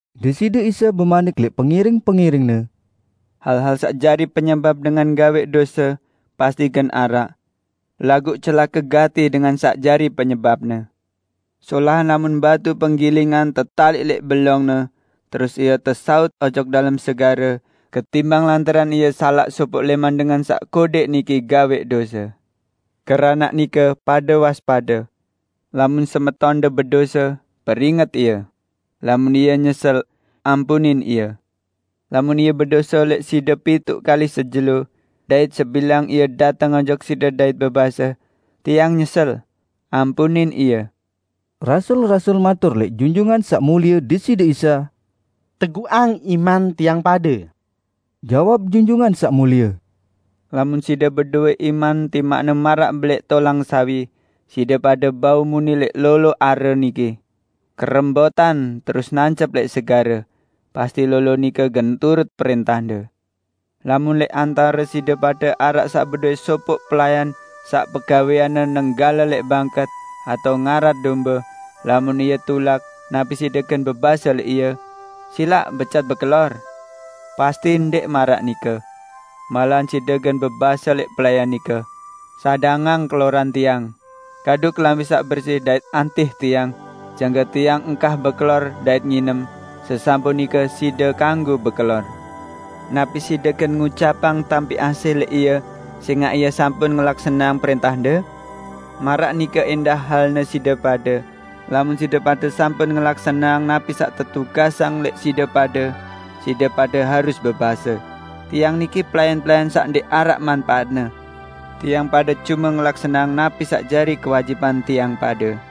Deside Isa bemanik lẽq pengiring-pengiring-Ne, "Hal-hal saq jari penyebap dengan gawẽq dose pasti gen araq. Laguq celake gati dengan saq jari penyebapne! Solahan lamun batu penggilingan tetaliq lẽq belongne terus ie tesaut ojok dalem segare ketimbang lantaran ie salaq sopoq lẽman dengan saq kodẽq niki gawẽq dose. Keranaq nike pade waspade! Lamun semetonde bedose, peringet ie. Lamun ie nyesel, ampunin ie. Lamun ie bedose lẽq side pituq kali sejelo, dait sebilang ie dateng ojok side dait bebase, 'Tiang nyesel,' ampunin ie." Rasul-rasul matur lẽq Junjungan Saq Mulie Deside Isa, "Teguqang iman tiang pade." Jawab Junjungan Saq Mulie, "Lamun side bedowẽ iman timaqne maraq belẽq tolang sawi, side pade bau muni lẽq lolo are niki, 'Kerembotan terus nancep lẽq segare,' pasti lolo nike gen turut prẽntahde." "Lamun lẽq antare side pade araq saq bedowẽ sopoq pelayan saq pegawẽanne nenggale lẽq bangket atao ngarat dombe, lamun ie tulak, napi side gen bebase lẽq ie, 'Silaq becat bekelor'? Pasti ndẽq maraq nike! Malahan side gen bebase lẽq pelayan nike, 'Sadangang keloran tiang. Kadu kelambi saq bersi dait antih tiang jangke tiang engkah bekelor dait nginem; sesampun nike side kanggo bekelor.' Napi side gen ngucapang tampi asih lẽq ie sẽngaq ie sampun ngelaksaneang prẽntahde? Maraq nike ẽndah halne side pade, lamun side pade sampun ngelaksaneang napi saq tetugasang lẽq side pade, side pade harus bebase, 'Tiang niki pelayan-pelayan saq ndẽq araq manpaatne; tiang pade cume ngelaksaneang napi saq jari kewajiban tiang pade.' "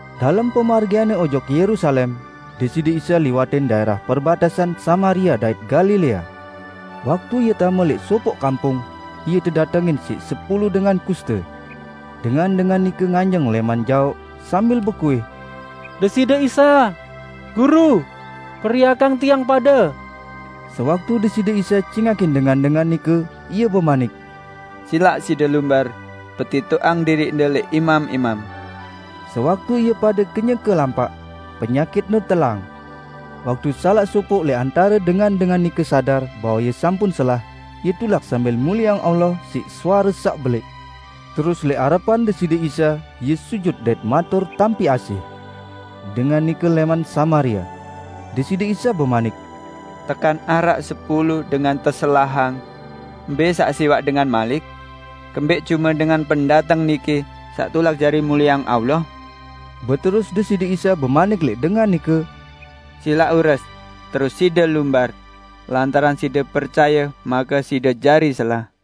Dalem pemargian-Ne ojok Yerusalem, Deside Isa liwatin daẽrah perbatesan Samaria dait Galilea. Waktu Ie tame lẽq sopoq kampung, Ie tedatengin siq sepulu dengan kuste. Dengan-dengan nike nganjeng lẽman jaoq sambil bekuih, "Deside Isa, Guru, periakang tiang pade!" Sewaktu Deside Isa cingakin dengan-dengan nike, Ie bemanik, "Silaq side lumbar, petitoqang diriqde lẽq imam-imam." Sewaktu ie pade kenyeke lampaq, penyakitne telang. Waktu salaq sopoq lẽq antare dengan-dengan nike sadar bahwe ie sampun selah, ie tulak sambil mulieang Allah siq suare saq belẽq. Terus lẽq arepan Deside Isa, ie sujut dait matur tampi asih. Dengan nike lẽman Samaria. Deside Isa bemanik, "Tekan araq sepulu dengan teselahang? Mbẽ saq siwaq dengan malik? Kembẽq cume dengan pendateng niki saq tulak jari mulieang Allah?" Beterus Deside Isa bemanik lẽq dengan nike, "Silaq ures, terus side lumbar, lantaran side percaye make side jari selah."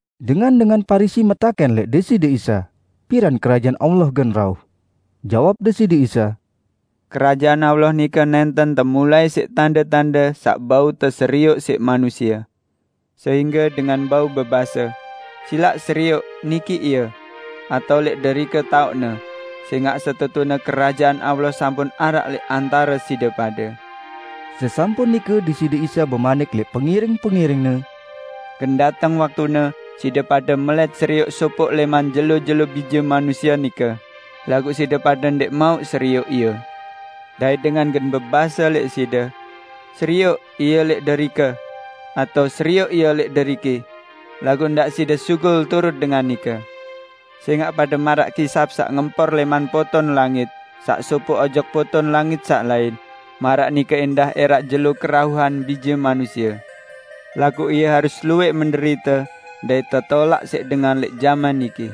Dengan-dengan Parisi metakẽn lẽq Deside Isa, piran Kerajaan Allah gen rauh. Jawab Deside Isa, "Kerajaan Allah nike nẽnten temulai siq tande-tande saq bau teserioq siq manusie, sehingge dengan bau bebase, 'Silaq serioq, niki ie!' atao 'Lẽq derike taoqne!' Sẽngaq setetune Kerajaan Allah sampun araq lẽq antare side pade." Sesampun nike Deside Isa bemanik lẽq pengiring-pengiring-Ne, "Gen dateng waktune side pade melẽt serioq sopoq lẽman jelo-jelo Bije Manusie nike, laguq side pade ndẽq mauq serioq ie. Dait dengan gen bebase lẽq side, 'Serioq, Ie lẽq derike!' atao 'Serioq Ie lẽq deriki!' Laguq ndaq side sugul turut dengan nike. Sẽngaq pade maraq kisap saq ngempor lẽman poton langit saq sopoq ojok poton langit saq lain, maraq nike ẽndah ẽraq jelo kerauhan Bije Manusie. Laguq Ie harus luwẽq menderite dait tetolaq siq dengan lẽq jaman niki.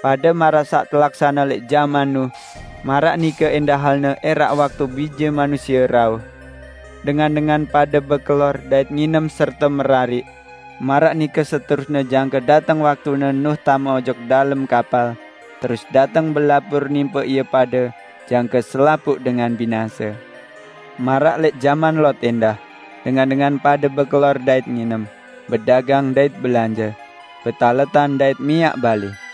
Pade maraq saq telaksane lẽq jaman Nuh, maraq nike ẽndah halne ẽraq waktu Bije Manusie rauh. Dengan-dengan pade bekelor dait nginem serte merariq; maraq nike seterusne jangke dateng waktune Nuh tame ojok dalem kapal terus dateng belabur nimpe ie pade jangke selapuq dengan binase. Maraq lẽq jaman Lot ẽndah, dengan-dengan pade bekelor dait nginem, bedagang dait belanje, betaletan dait miaq balẽ.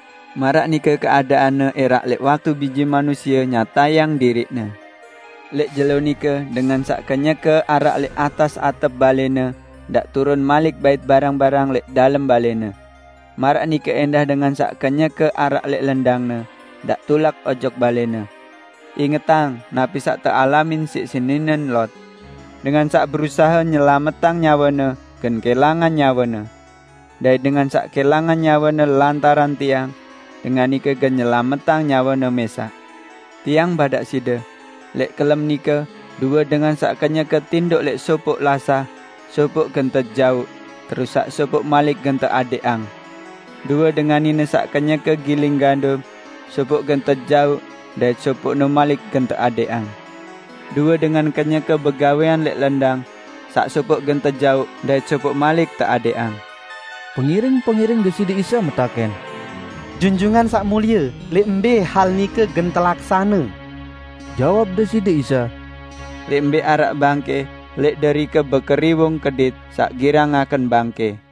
Maraq nike keadaanne ẽraq lẽq waktu Bije Manusie nyatayang diriq-Ne. Lẽq jelo nike, dengan saq kenyeke araq lẽq atas atep balẽne ndaq turun malik bait barang-barang lẽq dalem balẽne. Maraq nike ẽndah dengan saq kenyeke araq lẽq lendangne, ndaq tulak ojok balẽne. Ingetang, napi saq tealamin siq seninen Lot! Dengan saq berusahe nyelametang nyawene gen kẽlangan nyawene. Dait dengan saq kẽlangan nyawene lantaran Tiang, dengan nike gen nyelametang nyawene mẽsaq. Tiang badaq side: Lẽq kelem nike, due dengan saq kenyeke tindoq lẽq sopoq lasah, sopoq gen tejauq, terus saq sopoq malik gen teadẽqang. Due dengan nine saq kenyeke giling gandum, sopoq gen tejauq dait sopoqne malik gen teadẽqang. [ Due dengan kenyeke begawẽan lẽq lendang, saq sopoq gen tejauq, dait sopoq malik teadẽqang.]" Pengiring-pengiring Deside Isa metakẽn, "Junjungan Saq Mulie, lẽq mbẽ hal nike gen telaksane?" Jawab Deside Isa, "Lẽq mbẽ araq bangkẽ, lẽq derike bekeriwung kedit saq girang ngaken bangkẽ."